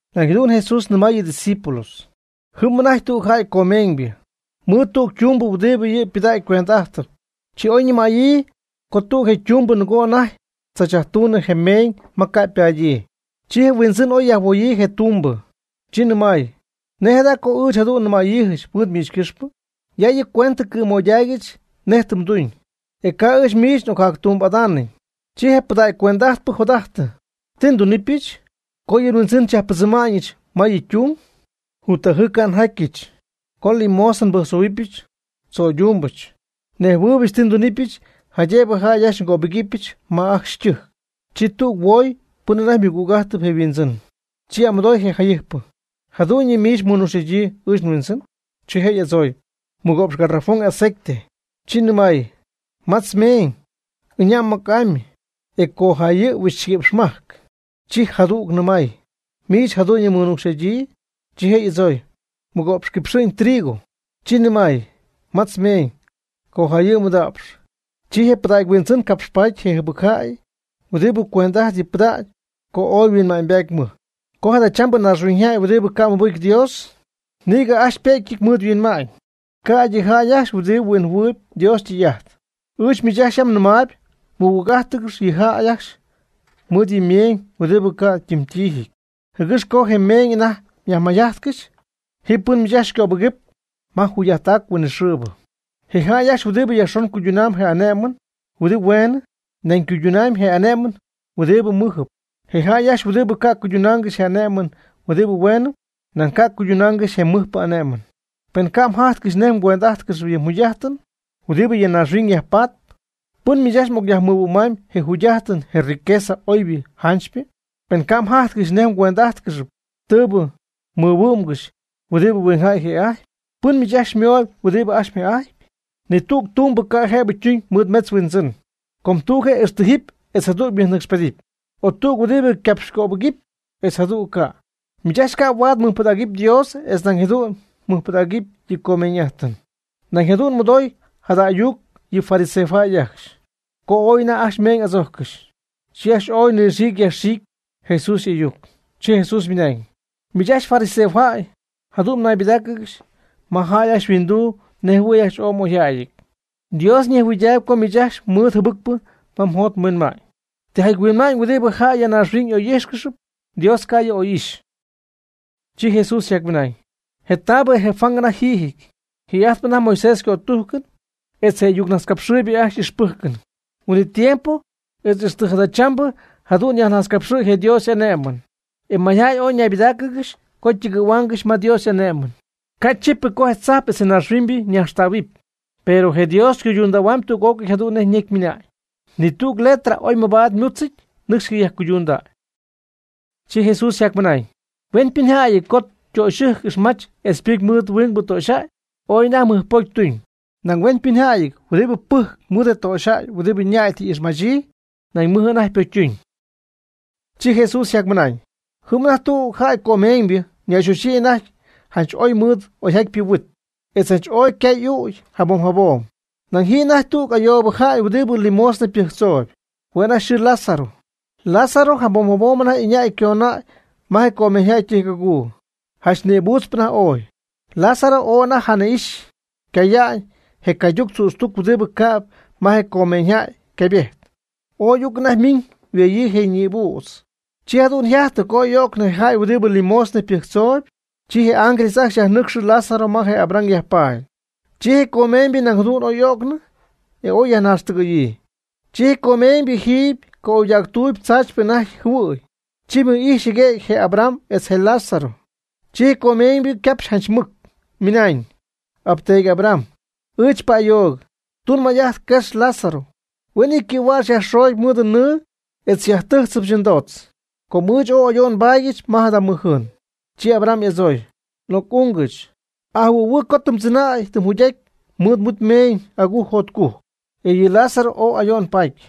Nañ jadu'n Jesús nɨmay yɨ' ydiscípulos: ―Jɨm anajty tügjäy comeeñybɨ, ymɨɨd tüg ytumbɨ huɨdi yɨ' ypɨdägy cuend'ájtɨp. Chi oy nɨmäyii co tüg je ytumbɨ nɨgoo anajty tzachyajtuñ je meeñ ma ycapaadyii. Chi je huindzɨn oy yajhuoyii je' ytumbɨ, chi nɨmay: “¿Nej jada co ɨɨch jadu'n nɨmäyiijɨch mɨɨd miich ycɨxpɨ? Ya yɨ cuentɨ cɨ̈moydaaygɨch nej tɨ mduñ, etz ca' ɨɨch miich n'ocjactumbɨ'adaanɨn.” Chi je pɨdägy cuend'ajtpɨ jot'ajtɨ: “¿Ti ndunɨpɨch? co yɨ' nhuindzɨn xyajpɨdzɨma'ñɨch ma yɨ ytung. Juttajɨɨ ca' njatyɨch, co limosna nbɨjctzohuɨpyɨch tzöydúmbɨch. Nejhuɨɨybɨch ti ndunɨpɨch jaydëb jäy ajcxy xycöbɨgɨpyɨch ma ajcxy ytɨjc.” Chi tüg tüg huoy pɨn anajty mɨnuucx'ajtp je' yhuindzɨn; chi y'amɨdooy je jayɨjpɨ: “¿Jadu'ñyɨ miich mɨnuucxy'adyii ɨɨch nhuindzɨn?” Chi je' y'adzooy: “Mɨgo'px garafón aceite.” Chi nɨmay: “Matz mnecy, ɨña' mɨc'amy, e cojayɨ' huixchiguïpxmajc.” Chi jadüg nɨmay: “¿Miich jadu'ñɨ mmɨnuucxy'adyii?” Chi je' y'adzooy: “Mɨgo'px quipxɨ'ñ trigo.” Chi nɨmay: “Matz mnecy, cojayɨ' mɨda'px.” Chi je pɨdägy huindzɨn capxpaaty je jɨbɨcjäybɨ huɨdi cuend'ajtp yɨ' ypɨdägy co oy yhuinma'ñybaady mɨj; co jadachambɨ naaxhuiñyjäy huɨdi ca' mɨbɨcy Dios, nïgɨ ajcxy ypëgyɨty mɨɨd yhuinma'ñ, ca'ydɨ yɨ jäy ajcxy huɨdi huinjɨhuɨɨyb Dios ytɨy'ajt. Ɨɨch miich ajcxy yam nɨmaayb mɨgüg'ájtɨgɨxy yɨ jäy ajcxy mɨɨd yɨ meeñ huɨdibɨ ca' ytɨmytiijyɨty, jɨgɨx co je meeñ anajty myajmayjajtcɨxy ji pɨn miich ajcxy xycöbɨgɨp ma jugy'ajttac huinɨxɨɨbɨ. Je' jäy ajcxy huɨdibɨ yajxon cuydunam je ané'mɨn huɨdi hueenɨ, nañ ycuydunamy je ané'mɨn huɨdibɨ mɨjɨp. Je jäy ajcxy huɨdibɨ ca' cuydunaangɨxy je ané'mɨn huɨdi hueenɨ, nañ ca' cuydunaangɨxy je mɨjpɨ ané'mɨn. Pen ca' mjajtcɨxy nej mgüend'ájtcɨxɨpy yɨ jugy'ájtɨn huɨdibɨ ya naaxhuiñ yajpatp, ¿pɨn miich ajcxy m'ocyajmɨhuɨ'mamy je jugy'ájtɨn je riqueza oybɨ janchypɨ? Pen ca' mjájtcɨxy nej mgüend'ájtcɨxɨpy tɨɨbɨ mɨhuɨ́'mgɨxy huɨdi huingjäy yje'ajtpy, ¿pɨn miich ajcxy xymöhuɨp huɨdibɨ ajcxy yjë'ajtpy? Ni tüg tumbɨ ca' jëbɨ ytuñ mɨɨd metz yhuindzɨn; com tüg je' ixtijɨpy etz jadüg mɨjnɨcxpedɨpy; o tüg huɨdi ycapxycöbɨgɨpy, etz jadüg ca'. Miich ajcxy ca' huaad mɨjpɨdägɨpy Dios etz nañ jadu'n mɨjpɨdägɨpy yɨ comeeñ'ájtɨn. Nañ jadu'n mɨdooy jada ayuc yɨ fariseojäy ajcxy, com ooy anajty ajcxy meeñ adzójccɨxy. Chi ajcxy ooy nɨxiicɨ yajxiicɨ Jesús y'ayuc. Chi Jesús ymɨnañ: ―Miich ajcxy fariseojäy jadu'n mnaybɨdáacɨgɨxy ma jäy ajcxy yhuinduu nejjɨhuɨ̈y ajcxy ooy m'oyjäyɨty. Dios ñejhuɨɨydaayb co miich ajcxy mɨɨd jɨbɨcpɨ ma mjot mhuinma'ñ. Tijaty huinma'ñ huɨdi jäy ya naaxhuiñ y'oy'ijxyp, Dios ca' yɨ' oy'ixy. Chi Jesús yjacmɨnañ: ―Je taabɨ je Juan anajty yjiijɨty, jii'ajtp anajty Moisés ycötújcɨn etz je y'ayucnajtzcapxɨɨybɨ ajcxy y'ixpɨ́jcɨn. Huin'it tiempo etz ixtɨ jadachambɨ jadu'n yajnajtzcapxɨ̈y je Dios y'ané'mɨn, e mayjäy ooy ñaybɨdáacɨgɨxy co ytɨgɨ̈huaangɨxy ma Dios y'ane'my. Ca'chípɨty co je tzajp etz naaxhuiñybɨ ñajxtähuɨpy, pero je Dios ycuydundähuamy tüg'ócɨy jadu'n nej ñecy ymɨna'ñ. Ni tügɨ letra oy mabaad ymúdzɨty nɨcxy ycayajcuyduñ. Chi Jesús yjacmɨnañ: ―Huenpɨnjäyɨty co ytöxyɨjc ixmach etz ypɨcy mɨɨd huingbɨ töxyjäy, ooy anajty mɨj pocy tuñ. Nañ huenpɨnjäyɨty huɨdibɨ pɨjcp mɨɨd je töxyjäy huɨdi ñäy tɨ y'ixmachyii, nañ mɨj anajty ypocytuñ. Chi Jesús yjacmɨnañ: ―Ji anajty tüg jäy comeeñybɨ ñayxoxyii anajty janch ooy mɨɨd oyjatypɨ huit, etz janch oy ycay y'ügy jabom jabom. Nañ ji anajty tüg ayoobɨ jäy huɨdi limosna pɨjctzoob, hue' anajty yxɨɨ Lázaro. Lázaro jabom jabom anajty ycögnäy ma je comeeñyjäy ytɨjc'aguu, janch nïbuutzp anajty ooy. Lázaro ooy anajty jani'ixy caya'ñ je cayduc tzütztuc huɨdibɨ cäb ma je comeeñyjäy ycaybejt. Oy uc anajty ymiiñ yhueyii je ñïbüdz. Chi jadu'n yjajtɨ co oy y'o'cnɨ je jäy huɨdi limosna pɨjctzoob, chi je ángeles ajcxy yajnɨcxy Lázaro ma je Abraham yajpaady. Chi je comeeñybɨ nañ jadu'n y'o'cnɨ, e oy yajnaaxtɨgɨ̈yii. Chi je comeeñybɨ jiiby ca'oydactuuby tzaachypɨ anajty jɨhuɨ̈y, chi mɨj'ijxy jɨguëgy je Abraham etz je Lázaro. Chi je comeeñybɨ ycapxy janch mɨc, ymɨnañ: “Apteedy Abraham, ɨɨch pa'ayoog. Tun may'ajt quex Lázaro, huen yɨ' ycɨ̈huäx yajxoogy mɨɨd nɨɨ etz xyajtɨ́jtzɨbɨch ndootz, co ɨɨch ooy ayo'n nbaadyɨch ma jada mɨj jɨɨn.” Chi Abraham y'adzooy: “Oc'ungɨch, ajɨhuɨ̈huɨɨ co tɨ mdzɨnäy tɨ mjugy'aty mɨɨd mhuit mmeeñ agujc jotcujc, e yɨ Lázaro ooy ayo'n paty.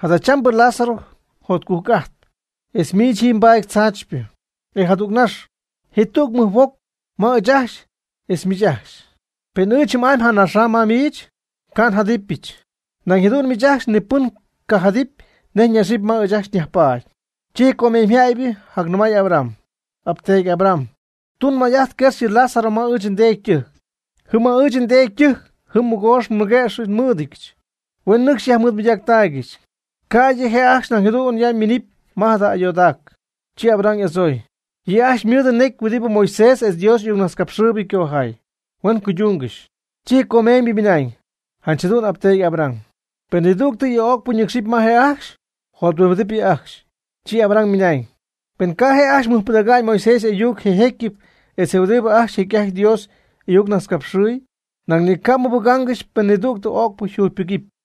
Jadachambɨ Lázaro yjotcujc'aty, etz miich jiiby mbatpy tzaachypɨ. E jadügnax, ji tüg mɨj huoc ma ɨɨch ajcxy etz miich ajcxy. Pen ɨɨch jɨm'amy janaxam ma miich, ca' njadɨpyɨch, nañ jadu'n miich ajcxy ni pɨn ca' jadɨpy nej ñaxɨpy ma ɨɨch nyajpaadyɨch.” Chi je comeeñybɨ jacnɨmay Abraham: “Apteedy Abraham, tun may'ajt quex yɨ Lázaro ma ɨɨch ndeedy ytɨjc. Jɨm ma ɨɨch ndeedy ytɨjc jɨm mɨgoox mɨguëx nmɨ́ɨdɨdyɨch, huen nɨcxy yajmɨɨdmɨydaaccɨxy, ca'ydɨ je' ajcxy nañ jadu'n ya minɨpy ma jada ayoodac.” Chi Abraham y'adzooy: “Yɨ' ajcxy ymɨɨd necy huɨdibɨ Moisés etz Dios y'ayucnajtzcapxɨɨybɨ ycojaay, huen cuydungɨxy.” Chi je comeeñybɨ ymɨnañ: “Janch jadu'n apteedy Abraham. Pen nidüg yɨ ögpɨ ñɨcxy ma je' ajcxy, jothuimbidɨp yɨ ajcxy.” Chi Abraham ymɨnañ: “Pen ca' je' ajcxy mɨjpɨdägy Moisés y'ayuc je jécyɨp etz huɨdi ajcxy jecy'ajt Dios y'ayucnajtzcapxɨɨy, nañ ni ca' mɨbɨ́jccɨxɨpy pen nidüg ögpɨ yjugypɨcy.”